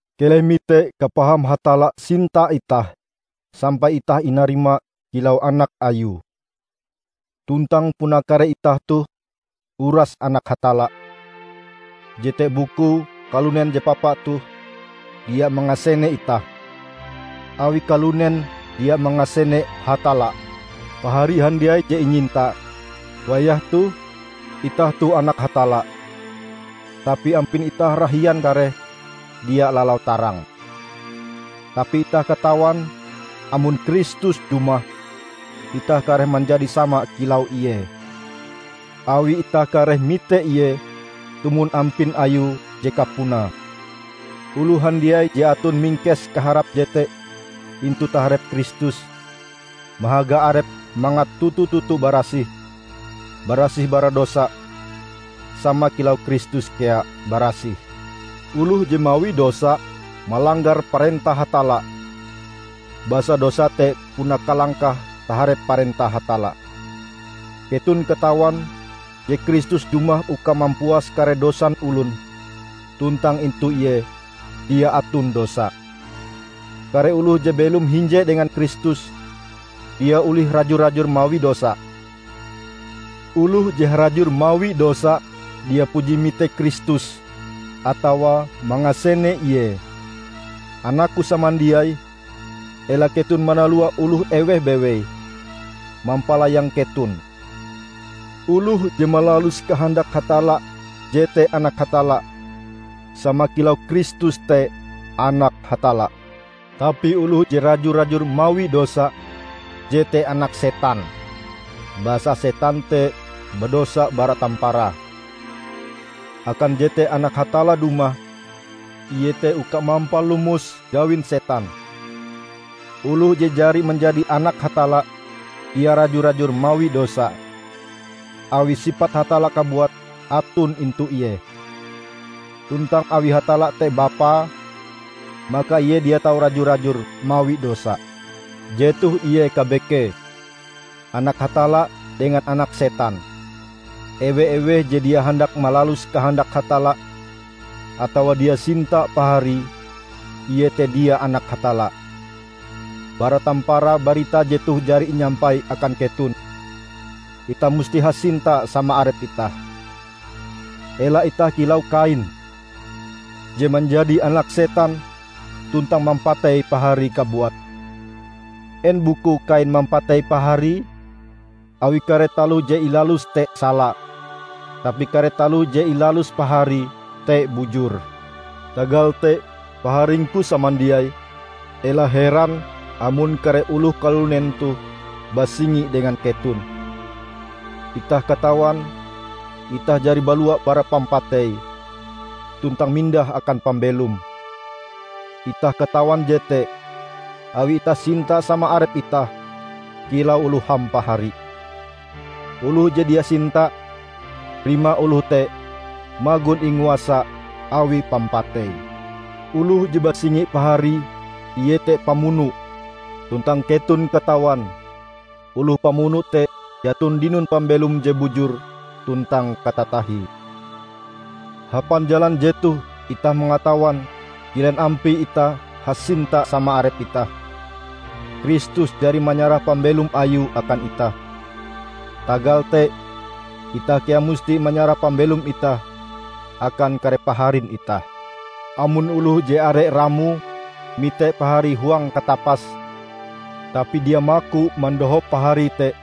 Keleh mite kapaham Hatalla sinta itah, sampai itah inarima kilau anak Ayue. Tuntang puna kare itah toh uras anak Hatalla. Jete bukue kalunen je papa toh dia mangasene itah, awi kalunen dia mangasene Hatalla. Pahari handiai je inyinta! Wayah toh, itah toh anak Hatalla, tapi ampin itah rahian kareh dia lalau tarang. Tapi itah katawan amon Kristus dumah, itah kareh manjadi sama kilau Ie, awi itah kareh mite Ie tumon ampin Ayue je kapunae. Oloh handiai je aton mingkes kaharap jete intu taharep Kristus, mahaga arepe mangat toto-toto barasih, barasih bara dosa sama kilau Kristus kea barasih. Oloh je mawi dosa, malanggar parentah Hatalla; basa dosa te puna kalangkah taharep parentah Hatalla. Keton katawan je Kristus dumah uka mampuas kare dosan olon, tuntang intu Ie dia aton dosa. Kare oloh je belom hinje dengan Kristus, dia olih raju-rajur mawi dosa. Oloh je harajur mawi dosa, dia puji mite Kristus atawa mangasene Ie. Anakku samandiai, ela keton manalua oloh eweh bewei, mampalayang keton. Oloh je malalus kahandak Hatalla jete anak Hatalla sama kilau Kristus te Anak Hatalla. Tapi oloh je raju-rajur mawi dosa jete anak setan, basa setan te badosa bara tamparae. Akan jete Anak Hatalla dumah iete uka mampalomos gawin Setan. Oloh je jari manjadi Anak Hatalla, dia raju-rajur mawi dosa, awi sipat Hatalla kabuat aton intu ie. Tuntang awi Hatalla te Bapae, maka ie dia tau raju-rajur mawi dosa. Jetoh ie kabekee, anak Hatalla dengan anak setan: ewe-eweh je dia handak malalus kahandak Hatalla, atawa dia sinta paharie, ie te dia anak Hatalla. Bara tamparae barita jetoh jari inyampai akan keton: Itah musti hasinta sama arep itah. Ela itah kilau Kain, je manjadi anak setan tuntang mampatei paharie kabuat. En bukue Kain mampatei paharie? Awi kare taloh je ilaluse te sala, tapi kare taloh je ilalus paharie te bujur. Tagal te, Paharingku samandiai, ela heran amon kare oloh kalunen toh basingi dengan keton. Itah katawan, itah jari balua bara pampatei, tuntang mindah akan pambelom. Itah katawan jete, awi itah sinta sama arep itah kilau oloh hampahari. Oloh je dia sinta, rimae oloh te magon inguasa awi pampatei. Oloh je basingi paharie ie te pamuno, tuntang keton katawan, oloh pamuno te jaton dinon pambelom je bujur tuntang katatahie. Hapan jalan jetoh itah mangatawan kilen ampie itah hasinta sama arep itah: Kristus jari manyarah pambelom Ayue akan itah. Tagal te, itah kea musti manyarah pambelom itah akan kare paharin itah! Amon oloh je are ramoe mite paharie huang katapas, tapi dia maku mandohop paharie te,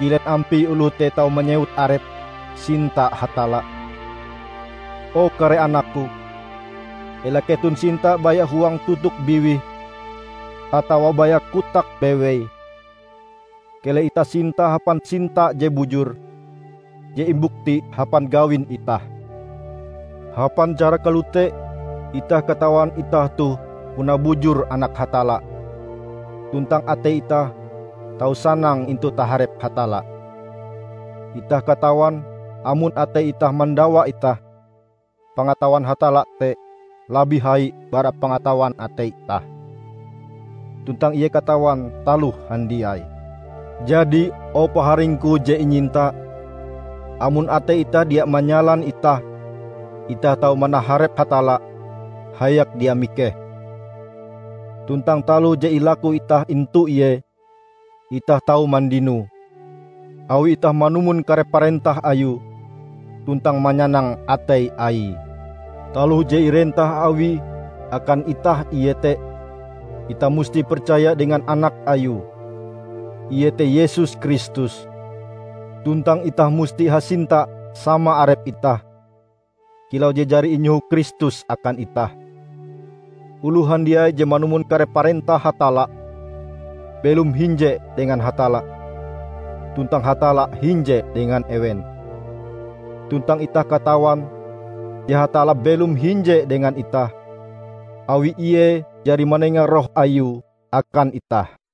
kilen ampie oloh te tau manyewut arepe sinta Hatalla? O kare anakku! Ela keton sinta baya huang totok biwih atawa baya kotak bewei. Keleh itah sinta hapan sinta je bujur, je imbukti hapan gawin itah. Hapan cara kalote itah katawan itah toh puna bujur anak Hatalla, tuntang atei itah tau sanang intu taharep Hatalla. Itah katawan amon atei itah mandawa itah, pangatawan Hatalla te labih hai bara pangatawan atei itah, tuntang Ie katawan taloh handiai. Jadi, o Paharingku je inyinta, amon atei itah dia manyalan itah, itah tau manaharep Hatalla hayak dia mikeh. Tuntang taloh je ilaku itah intu Ie, itah tau mandinoe, awi itah manumon kare parentah Ayue tuntang manyanang atei Aie. Taloh je irentah Awie akan itah iete: Itah musti percaya dengan Anak Ayue, iete Yesus Kristus, tuntang itah musti hasinta sama arep itah, kilau je jari inyoho Kristus akan itah. Oloh handiai je manumon kare parentah Hatalla, belom hinje dengan Hatalla, tuntang Hatalla hinje dengan ewen. Tuntang itah katawan je Hatalla belom hinje dengan itah, awi ie jari manenga Roh Ayue akan itah.